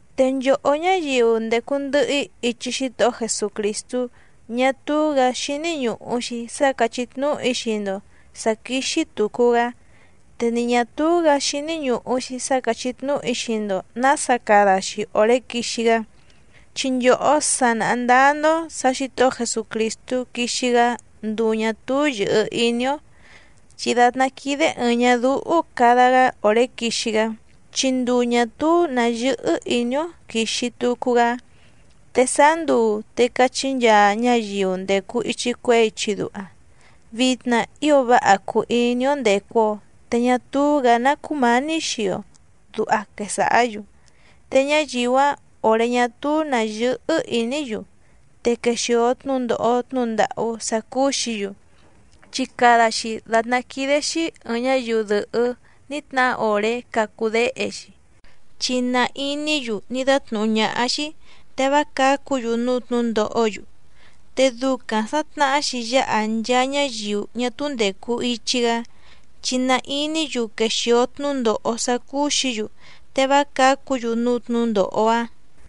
Te nchòhó ñáyiu ndècu ndɨhɨ‑í ichi Xítohó Jesucrìstú ñá túú‑gǎ xíní ñùhu‑xi sá càchí tnúhu‑í xii‑ndo sǎ quíxí tùcu‑gá, te ni ñà túú‑gǎ xíní ñùhu‑xi sá càchí tnúhu‑í xii‑ndo nǎsa cada‑xi òré quixi‑gá. Chi nchòhó sa nàha ndáá‑ndó sǎ Xǐtohó Jesucrìstú quixi‑gá nduu ñà túú yɨ̀hɨ iní‑ó, chi dàtná quídé ɨ̀ɨⁿ ñadúhú cada‑gá òré quixi‑gá, chi nduu ñà túú nǎ yɨ́hɨ́ ìní‑ó quìxi tucu‑gá. Te sáá nduu te cachí nchaa ñáyiu ndècu ichi cuehé ichi duha: “Vitna ío váha cùu iní‑ó ndècu‑o, te ñá túú‑gǎ ná cúmǎní xii‑o”, duha quesàhá‑yu. Te ñáyiu‑áⁿ òré ñá túú nǎ yɨ́hɨ́ ìní‑yu, te quèxio tnúndòho tnúhu ndàhú sá cúú‑xǐ‑yu. Chi cada‑xi dàtná quídé‑xí ɨ̀ɨⁿ ñáyiu dɨ̀hɨ́ ní tnahá òré cacu déhe‑xi, chi na iní‑yu ní dátnùhú ñáhá‑xí te vá cǎcu‑yu núú tnǔndòhó‑yu, te ducaⁿ sǎ tnàhá‑xi yáha nchaa ñáyiu ñá túú ndècu ichi‑gá, chi na iní‑yu quexìo tnúndòho sá cúú‑xǐ‑yu te vá cǎcu‑yu núú tnǔndòho‑áⁿ.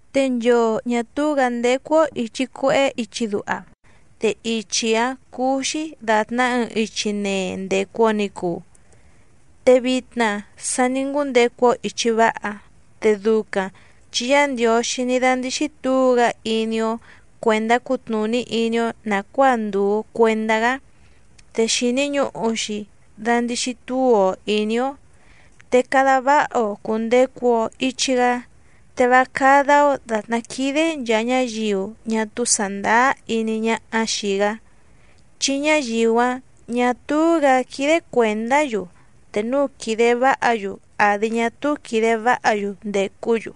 Te nchoo ñà túú‑gǎ ndécú‑ó ìchi cuehé ichi duha, te ichi‑áⁿ cúú‑xí dàtná ɨɨⁿ ichi nee ndècu‑o ni cuu, te vitna sa ní ngúndecu‑o ìchi váha, te ducaⁿ chi Yá Ndiǒxí ní dándíxí tǔu‑gá iní‑ó cuèndá cutnùní iní‑ó nàcuáa ndùu cuendá‑gá. Te xìni ñuhu‑xi dandixi túu‑o ìní‑ó, te cada váha‑o cùndecu‑o ichi‑gá, te vá cádá‑ó dàtná quídé nchàa ñáyiu ñá túú sàndáá iní ñáhá xìi‑gá, chi ñáyiu‑áⁿ ñà túú‑gǎ quídé cuèndá‑yu te núu quìde váha‑yu àdi ñá túú quìde váha‑yu ndècú‑yu.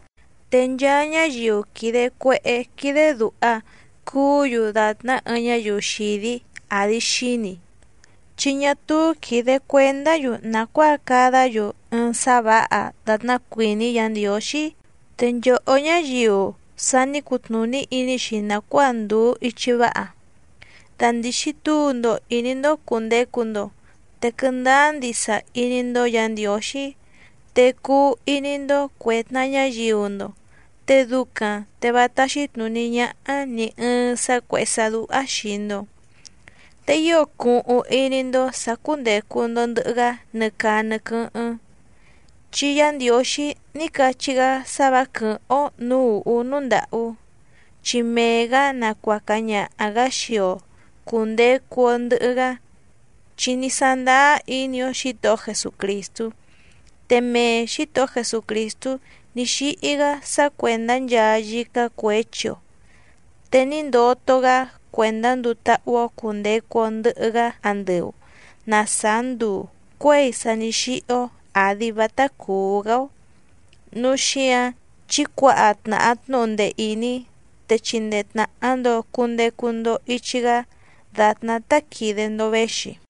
Te nchaa ñáyiu quìde cuehé quídé dùha cuú‑yu dàtná ɨɨⁿ ñáyiu xìdí àdi xíni, chi ñá túú quìde cuendá‑yu nàcuáa cadá‑yu ɨɨⁿ sá vǎha dàtná cuìní Yǎ Ndiǒxí. Te nchòhó ñáyiu sa ní cutnùní iní‑xi nàcuáa ndùu ichi váha, dandìxi túu‑ndo ìní‑ndó cùndecu‑ndo, te quɨndáá ndisa iní‑ndó Yǎ Ndiǒxí, te cuu iní‑ndó cuè tnaha ñáyiu‑ndo te ducaⁿ te vá táxí tnùní ñáhá nì ɨɨⁿ sá cuèhé sá dúhá xìi‑ndo. Te ío cuhuⁿ iní‑ndó sǎ cúndècu‑ndo ndɨhɨ‑gá nɨ caa nɨ quɨ́hɨ́ⁿ. Chi Yá Ndiǒxí ní cachí‑gá sá vǎ quɨ̀hɨ́ⁿ‑ó nǔú ùhú núú ndàhú, chi mee‑gǎ nacuaca ñaha‑gǎ xii‑o cùndecu‑o ndɨhɨ‑gá, chi ní sándáá iní‑ó Xǐtohó Jesucrìstú. Te mee Xǐtohó Jesucrìstú ní xíhí‑gá sá cuèndá nchaa yícá cuěchi‑o, te ní ndoto‑gá cuèndá nduu táhú‑ó cùndecu‑o ndɨhɨ‑gá andɨu na sàá nduu cuěi sa ní xíhí‑ó, àdi vátá cùú‑gá‑ó. Núu xíǎⁿ chí cuǎha tnàha tnúhu ndee ìní, te chindee tnàha‑ndo cundecu‑ndo ichi‑gá dàtná tá quìde‑ndo véxi.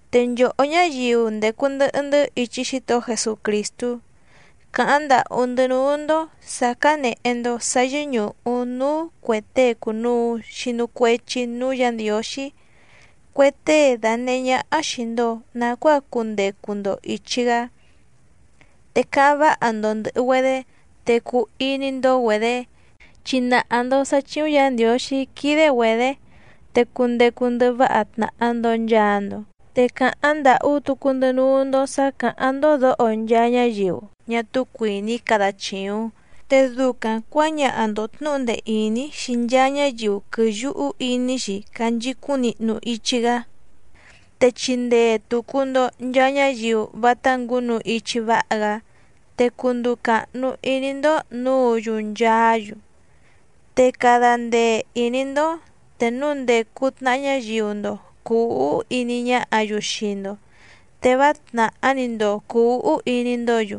Te nchòhó ñáyiu ndècu ndɨhɨ‑ndɨ́ ichi Xítohó Jesucrìstú, càháⁿ ndàhú‑ndɨ́ núú‑ndó sǎ cánèhe‑ndo sá yɨ́ñùhu núú cuè tée cùnuu xinu cuechi núú Yǎ Ndiǒxí, cue tée dànehé ñáhá xìi‑ndo nacuáa cundecu‑ndo ìchi‑gá. Te cáháⁿ váha‑ndo ndɨ̀hɨ‑güedé, te cuu iní‑ndó‑güedě, chi nàha‑ndo sá chíúⁿ Yǎ Ndiǒxí quídé‑güedě. Te cundecu ndɨhɨ váha tnàha‑ndo nchaa‑ndo. Te càháⁿ ndàhú tucu‑ndɨ́ núú‑ndó sǎ cáháⁿ‑ndó dǒho nchaa ñáyiu ñá túú cuìní cada chìuⁿ, te ducaⁿ cuǎñaha‑ndo tnǔhu ndee ìní xii nchaa ñáyiu quɨ̀yuhu iní‑xi canchicúⁿ nihnu ichi‑gá, te chindee tùcu‑ndo nchaa ñáyiu vátá ngǔnu ichi váha‑gá, te cunduu càhnu iní‑ndó nǔǔ‑yu nchaá‑yu. Te cada ndee ìní‑ndó te núu ndècu tnaha ñáyiu‑ndo cùu úhú iní ñáhǎ‑yu xii‑ndo, te vá tnàhá‑ni‑ndo cùu úhú iní‑ndǒ‑yu.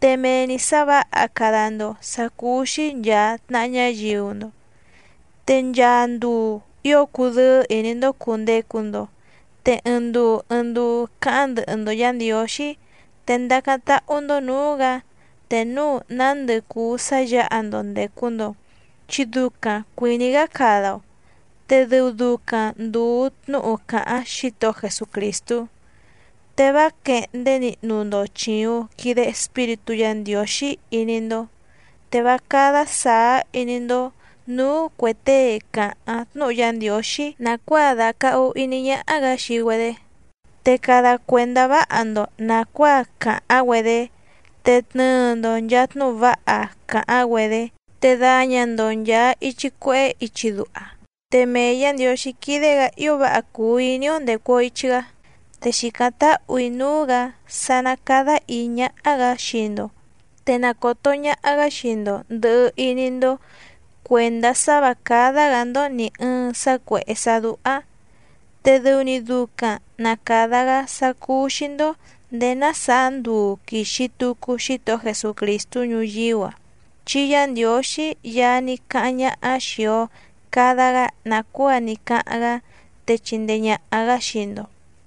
Te mee‑ni sǎ vǎha cada‑ndo sǎ cúú‑xí nchàa tnaha ñáyiu‑ndo. Te nchaa nduu ío cudɨ́ɨ́ ìní‑ndó cùndecu‑ndo. Te ɨɨⁿ nduu ɨɨⁿ nduu cáháⁿ ndɨhɨ‑ndo Yǎ Ndiǒxí. Te ndacáⁿ táhú‑ndó nǔú‑gǎ te núu nándɨ cùu sá yǎha‑ndo ndècu‑ndo, chi ducaⁿ cuìní‑gá cada‑o, te dɨu ducaⁿ ndùu tnúhu càháⁿ Xítohó Jesucrìstú. Te vá quèhndé nihnu‑ndo chìuⁿ quide Espíritú Yǎ Ndiǒxí iní‑ndó. Te vá cádá sàá iní‑ndó nǔú cuè tée càháⁿ tnúhu Yá Ndiǒxí nàcuáa dàcahu iní ñáhá‑gǎ xii‑güedé. Te cada cuèndá váha‑ndo nàcuáa càháⁿ‑güedé, te tnɨɨ‑ndo nchàa tnúhu váha càháⁿ‑güedé. Te daña‑ndo nchàa ichi cuehé ichi duha. Te mee Yǎ Ndiǒxí quídé‑gǎ ío váha cùu iní‑ó ndècu‑o ichi‑gá. Te xìcáⁿ táhù‑í núú‑gǎ sá ná càda íí ñáhá‑gǎ xii‑ndo, te na còto ñaha‑gá xii‑ndo ndɨ̀hɨ iní‑ndó cuèndá sá vǎ cádá‑gǎ‑ndó nì ɨɨⁿ sá cuèhé sá dúhá, te dɨu‑ni ducaⁿ na càda‑gá sá cúú‑xí‑ndó nděé ná sàá nduu quìxi tucu Xítohó Jesucrìstú ñuyíú‑a. Chi Yá Ndiǒxí Yaá ní cáháⁿ ñáhá xìi‑o cada‑gá nàcuáa ní cáháⁿ‑gá, te chindee ñàha‑gá xii‑ndo.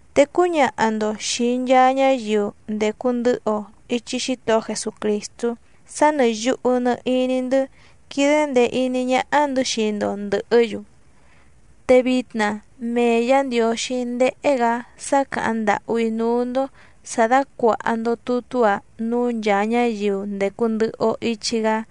Te cúñaha‑ndo xìi nchaa ñáyiu ndècu ndɨhɨ‑o ichi Xítohó Jesucrìstú sá nɨ̀ yuhu nɨ iní‑ndɨ́ quídé ndèe iní ñáhá‑ndɨ̌ xii‑ndo ndɨ̀hɨ́‑yu. Te vitna mee Yǎ Ndiǒxí ndéhé‑gǎ sá càháⁿ ndàhú‑í núú‑ndó sǎ dácuàha‑ndo tutú‑a núú nchàa ñáyiu ndècu ndɨhɨ‑o ichi‑gá.